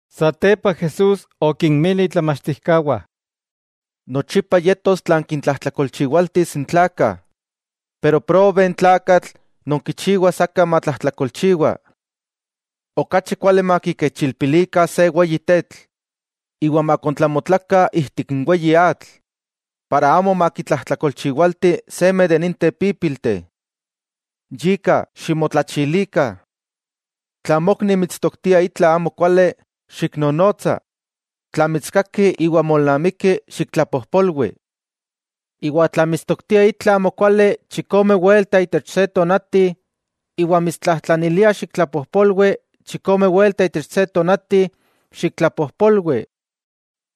Satepa Jesús okinmili itlamachtijkawah: —Nochipa yetos tlan kintlajtlakolchiwaltis n tlakah. Pero ¡probe n tlakatl non kichiwas aka matlajtlakolchiwa! Okachi kuali makikechilpililikah se weyi tetl, iwa makontlamotlakah ijtik n weyi atl, para amo makitlajtlakolchiwalti seme de ninteh pípilteh. ¡Yika, ximotlachilikah! 'Tla mokni mitstoktia itla amokuali, xiknonotsa; tla mitskaki iwa molnamiki, xiktlapojpolwi. Iwa tla mitstoktia itla amokuali chikome welta itech se tonati, iwa mitstlajtlanilia xiktlapojpolwi chikome welta itech se tonati, xiktlapojpolwi.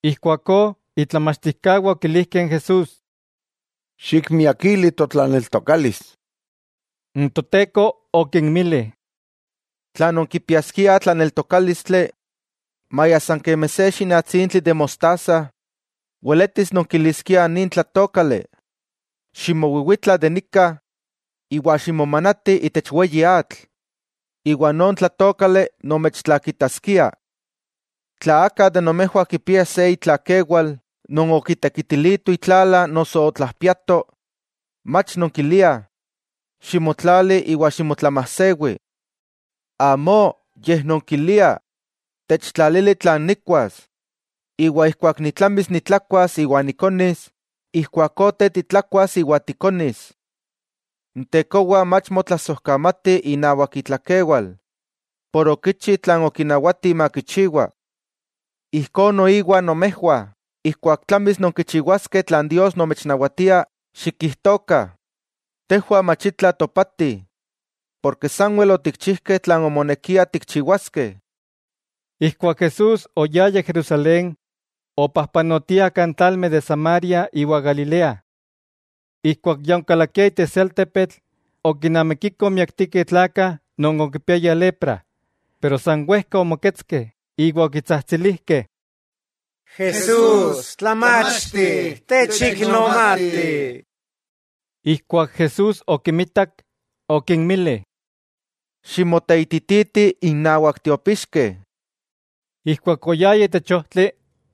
Ijkuakó itlamachtijkawah okilijkeh n Jesús: —Xikmiakili totlaneltokalis. N Toteko okinmili: —Tla nonkipiaskiah tlaneltokálistli, maya san kemi se xinatsintli de mostaza, weletis nonkiliskiah nin tlatoókali: “Ximowiwitla de nika iwa ximomanati itech weyi atl”, iwa non tlatoókali nomechtlakitaskia. 'Tla aka de nomejwah kipia se itlakewal non okitekitilito itlala noso otlajpiato, mach nonkiliah: “Ximotlali iwa ximotlamajsewi.” Amó, yej nonkiliah: “Techtlalili tlan nikkuas, iwa ijkuak nitlamis nitlakuas iwa nikonis ijkuakó te titlakuas iwa tikonis.” ¡N tekowa mach motlasojkamati inawak itlakewal, por okichi tlan okinawati makichiwa! Ijkó noiwa nomejwah, ijkuak tlamis nonkichiwaskeh tlan Dios nomechnawatia, xikijtokah: “Tejwah mach itla topatih, porke sanwel otikchijkeh tlan omonekia tikchiwaskeh.” Ijkuak Jesús oyaya Jerusalén, opajpanotia kan tlalmeh de Samaria iwa Galilea. Ijkuak ya onkalakia itech se altepetl, okinamikikoh májtlakteh tlakah non okipiaya lepra, pero san wejka omoketskeh iwa okitsajtsilijkeh: —¡Jesús! ¡Tlamachti! ¡Techiknomati! Ijkuak Jesús okimitak, okinmili: —Ximoteitititih innawak tiopixkeh. Ijkuak oyayah itech ojtli,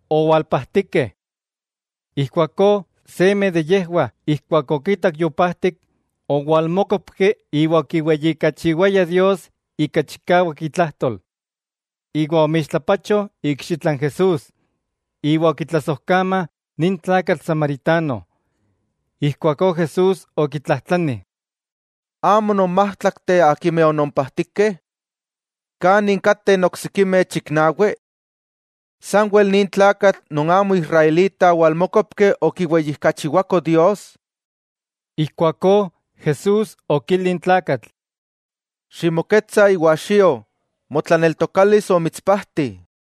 owalpajtikeh. Ijkuakó seme de yejwah ijkuak okitak yopajtik, owalmókopki iwa okiweyijkachiwaya Dios ika chikawak itlajtol, iwa omixtlapacho ikxitla n Jesús, iwa okitlasojkama nin tlakatl samaritano. Ijkuakó Jesús okitlajtlani: —¿Amo non májtlakteh akimeh onompajtikeh? ¿Kanin kateh n oksikimeh chiknawi? ¿Sanwel nin tlakatl non amo israelita owalmókopki okiweyijkachiwako Dios? Ijkuakó Jesús okili n tlakatl: —Ximoketsa iwa xio, motlaneltokalis omitspajti.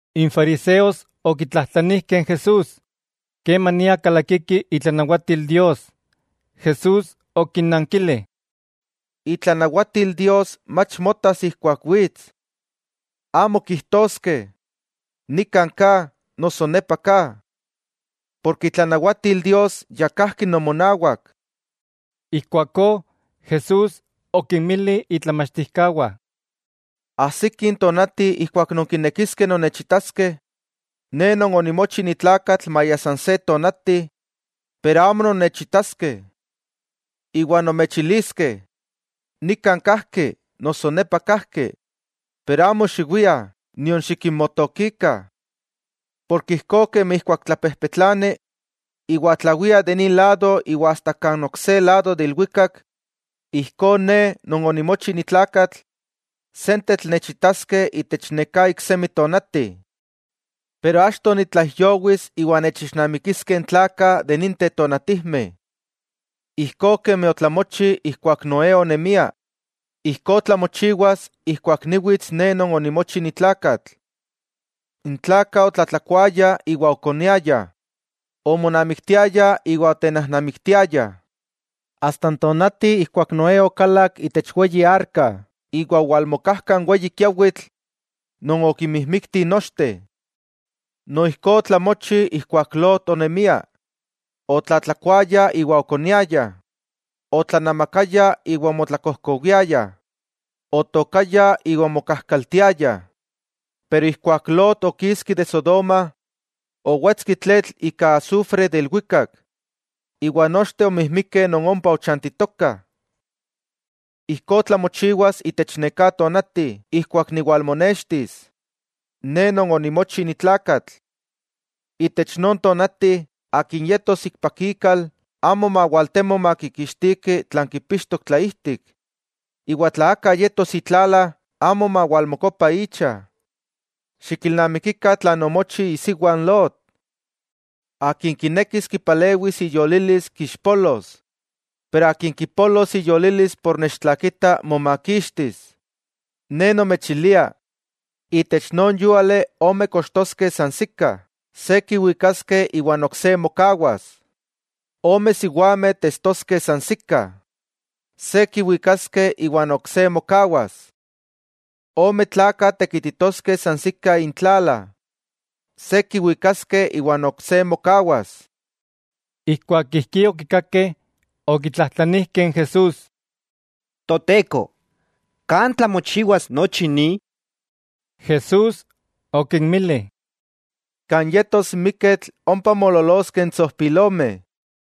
N fariseos okitlajtlanijkeh n Jesús, kemania kalakiki itlanawatil Dios. Jesús okinnankili: —Itlanawatil Dios mach motas ijkuak wits. Amo kijtoskeh, “Nikan ka”, noso “Nepa ka”, porke itlanawatil Dios ya kajki nomonawak. Ijkuakó Jesús okinmili itlamachtijkawah: —Ajsiki n tonati ijkuak nonkinekiskeh nonnechitaskeh Ne Non onimochi ni tlakatl maya san se tonati, pero amo nonnechitaskeh. Iwa nomechiliskeh: “Nikan kajki”, noso “Nepa kajki.” Pero amo xiwiah, nion xikinmotokikah. Porke ijkó kemi ijkuak tlapejpetlani iwa tlawia de nin lado iwa asta kan ok se lado de ilwikak, ijkó Ne Non onimochi ni tlakatl sentetl nechitaskeh itech neká iksemi tonati. Pero achto nitlaijyowis iwa nechixnamikiskeh n tlakah de ninteh tonatijmeh. Ijkó kemi otlamochi ijkuak Noé onemia, ijkó tlamochiwas ijkuak niwits Ne Non onimochi ni tlakatl. N tlakah otlatlakuayah iwa okoniayah, omonamiktiayah iwa otenajnamiktiayah, asta n tonati ijkuak Noé okalak itech weyi arka iwa owalmokajka n weyi kiawitl non okimijmiktih nochteh. Noijkó otlamochi ijkuak Lot onemia: otlatlakuayah iwa okoniayah, otlanamakayah iwa omotlakojkowiayah, otookayah iwa omokajkaltiayah; pero ijkuak Lot okiski de Sodoma, owetski tletl ika asufre de ilwikak, iwa nochteh omijmikeh non ompa ochantitokah. Ijkó tlamochiwas itech neká tonati ijkuak niwalmonextis, Ne Non onimochi ni tlakatl. 'Itech non tonati, akin yetos ikpak ikal, amo mawaltemo makikixtiki tlan kipixtok tlaijtik; iwa tla aka yetos itlala amo mawalmokopa icha. Xikilnamikikah tlan omochi isiwa n Lot. Akin kinekis kipalewis iyolilis kixpolos, pero, akin kipolos iyolilis por nechtlakita momakixtis. 'Ne nomechilia, itech non yúali ome kochtoskeh san sika; se kiwikaskeh iwa n ok se mokawas. Ome siwameh testoskeh sansikah; se kiwikaskeh iwa n ok se mokawas. Ome tlakah tekititoskeh sansikah intlala; se kiwikaskeh iwa n ok se mokawas. Ijkuak ijkí okikakeh, okitlajtlanijkeh n Jesús: —¿Toteko, kan tlamochiwas nochi ni? Jesús okinmili: —Kan yetos n miketl, ompa moololoskeh n tsojpilomeh.